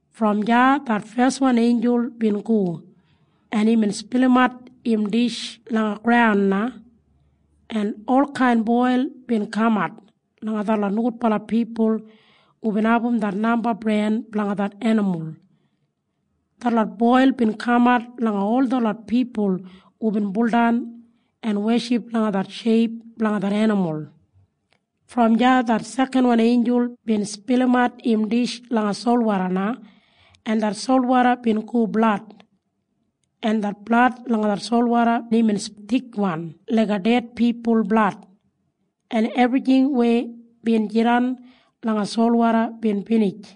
Brom deya det feswan einjul bin go, en imbin spilimat im dish langa graun na, en olkain boil bin kamat langa detlot nogudbala pipul hubin abum det namba bren blanga det enimul. Detlot boil bin kamat langa ol detlot pipul hubin buldan en weship langa det sheip blanga det enimul. Brom deya det sekanwan einjul bin spilimat im dish langa solwoda na, en det solwoda bin go blad. En det blad langa det solwoda imbin thikwan laiga ded pipul blad, en ebrijing weya bin jidan langa solwoda bin binij.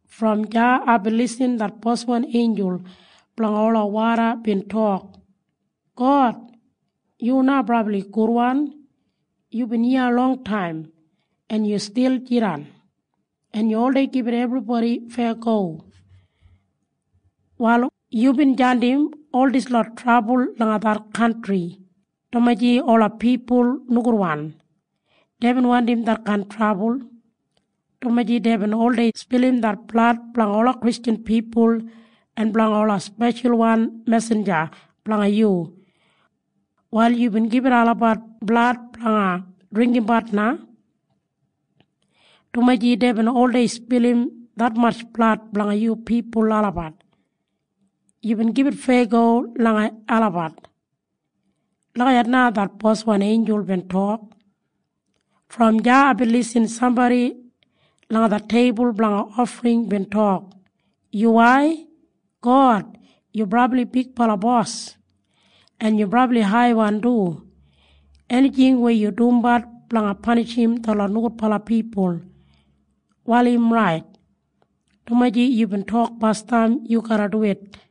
Brom deya aibin lisin det boswan einjul blanga ola woda bin tok, “God, yu na brabli gudwan. Yubin iya longtaim, en yu stil jidan. En yu oldei gibit ebribodi feyago. Wal yubin jandim ol dislot trabul langa det kantri, dumaji ola pipul nogudwan. Deibin wandim detkain trabul, dumaji deibin oldei spilim det blad blanga ola Kristjan pipul en blanga ola speshalwan mesinja blanga yu. Wal yubin gibit olabat blad blanga dringgimbat na, dumaji deibin oldei spilim detmatj blad blanga yu pipul olabat. Yubin gibit feyago langa olabat.” Lagijat na det boswan einjul bin tok. Brom deya aibin lisin sambodi langa det teibul blanga ofring bin tok, “Yuwai, God. Yu Brabli Haibala Bos, en yu brabli haiwan du. Enijing weya yu dumbat blanga panishim detlot nogudbala pipul, wal im rait, dumaji yubin tok basdam yu garra duwit.”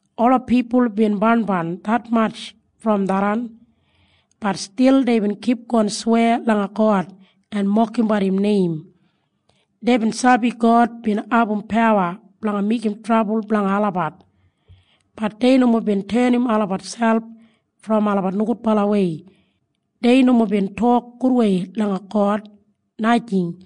Ola pipul bin barnbarn detmatj brom tharran. Bat stil deibin kipgon sweya langa God en mokimbat im neim. Deibin sabi God bin abum pawa blanga meigim trabul blanga olabat. Bat dei nomo bin tenim olabat selp brom olabat nogudbalawei. Dei nomo bin tok gudwei langa God, najing.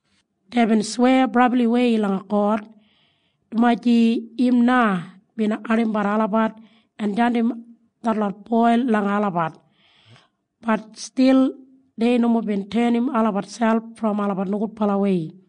Deibin sweya brabliwei langa God, dumaji im na bin ardimbat olabat en jandim detlot boil langa olabat. Bat stil dei nomo bin tenim olabat selp brom olabat nogudbalawei.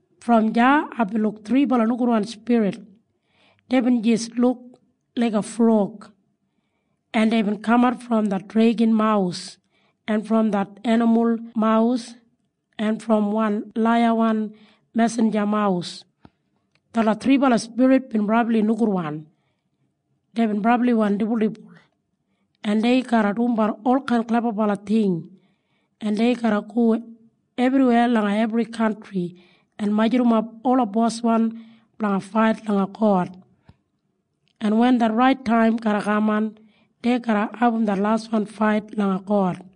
Brom deya aibin luk thribala nogudwan spirit. Deibin jis luk laiga frog, en deibin kamat brom det dregan mawus en brom det enimul mawus en brom wan laiyawan mesinja mawus. Detlot thribala spirit bin brabli nogudwan. Deibin brabliwan dibuldibul, en dei garra dumbat olkain klebabala ting, en dei garra go ebriweya langa ebri kantri en majurrumap ola boswan blanga fait langa God. En wen det rait taim garra kaman, dei garra abum det laswan fait langa God.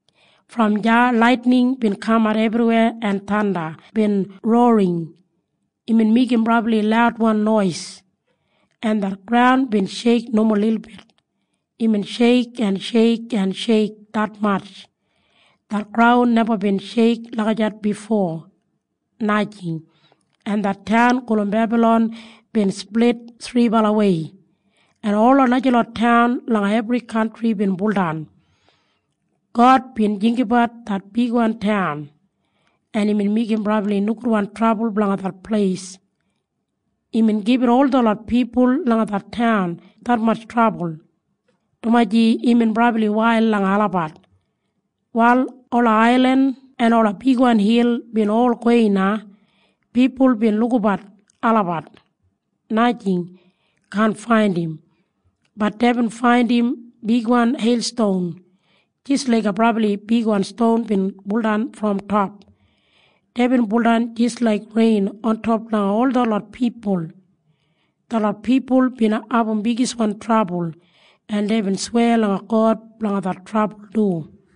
Brom deya laitining bin kamat ebriweya en thanda bin rorring. Imbin meigim brabli laudwan nois, en det graun bin sheik nomo lilbit. Imbin sheik en sheik en sheik detmatj. Det graun neba bin sheik lagijat bifo, najing. En det taun gulum Bebalon bin split thribalawei, en ola najalot taun langa ebri kantri bin buldan. God bin jinggabat det bigwan taun, en imbin meigim brabli nogudwan trabul blanga det pleis. Imbin gibit ol detlot pipul langa det taun detmatj trabul, dumaji imbin brabli wail langa olabat. Wal ola ailin en ola bigwan hil bin ol gowei na. Pipul bin lukabat olabat, najing, kaan faindim. Bat deibin faindim bigwan heilston jis laiga brabli bigwan ston bin buldan brom top. Deibin buldan jis laik rein ontop langa ol detlot pipul. Detlot pipul bin abum bigiswan trabul, en deibin sweya langa God blanga det trabul du.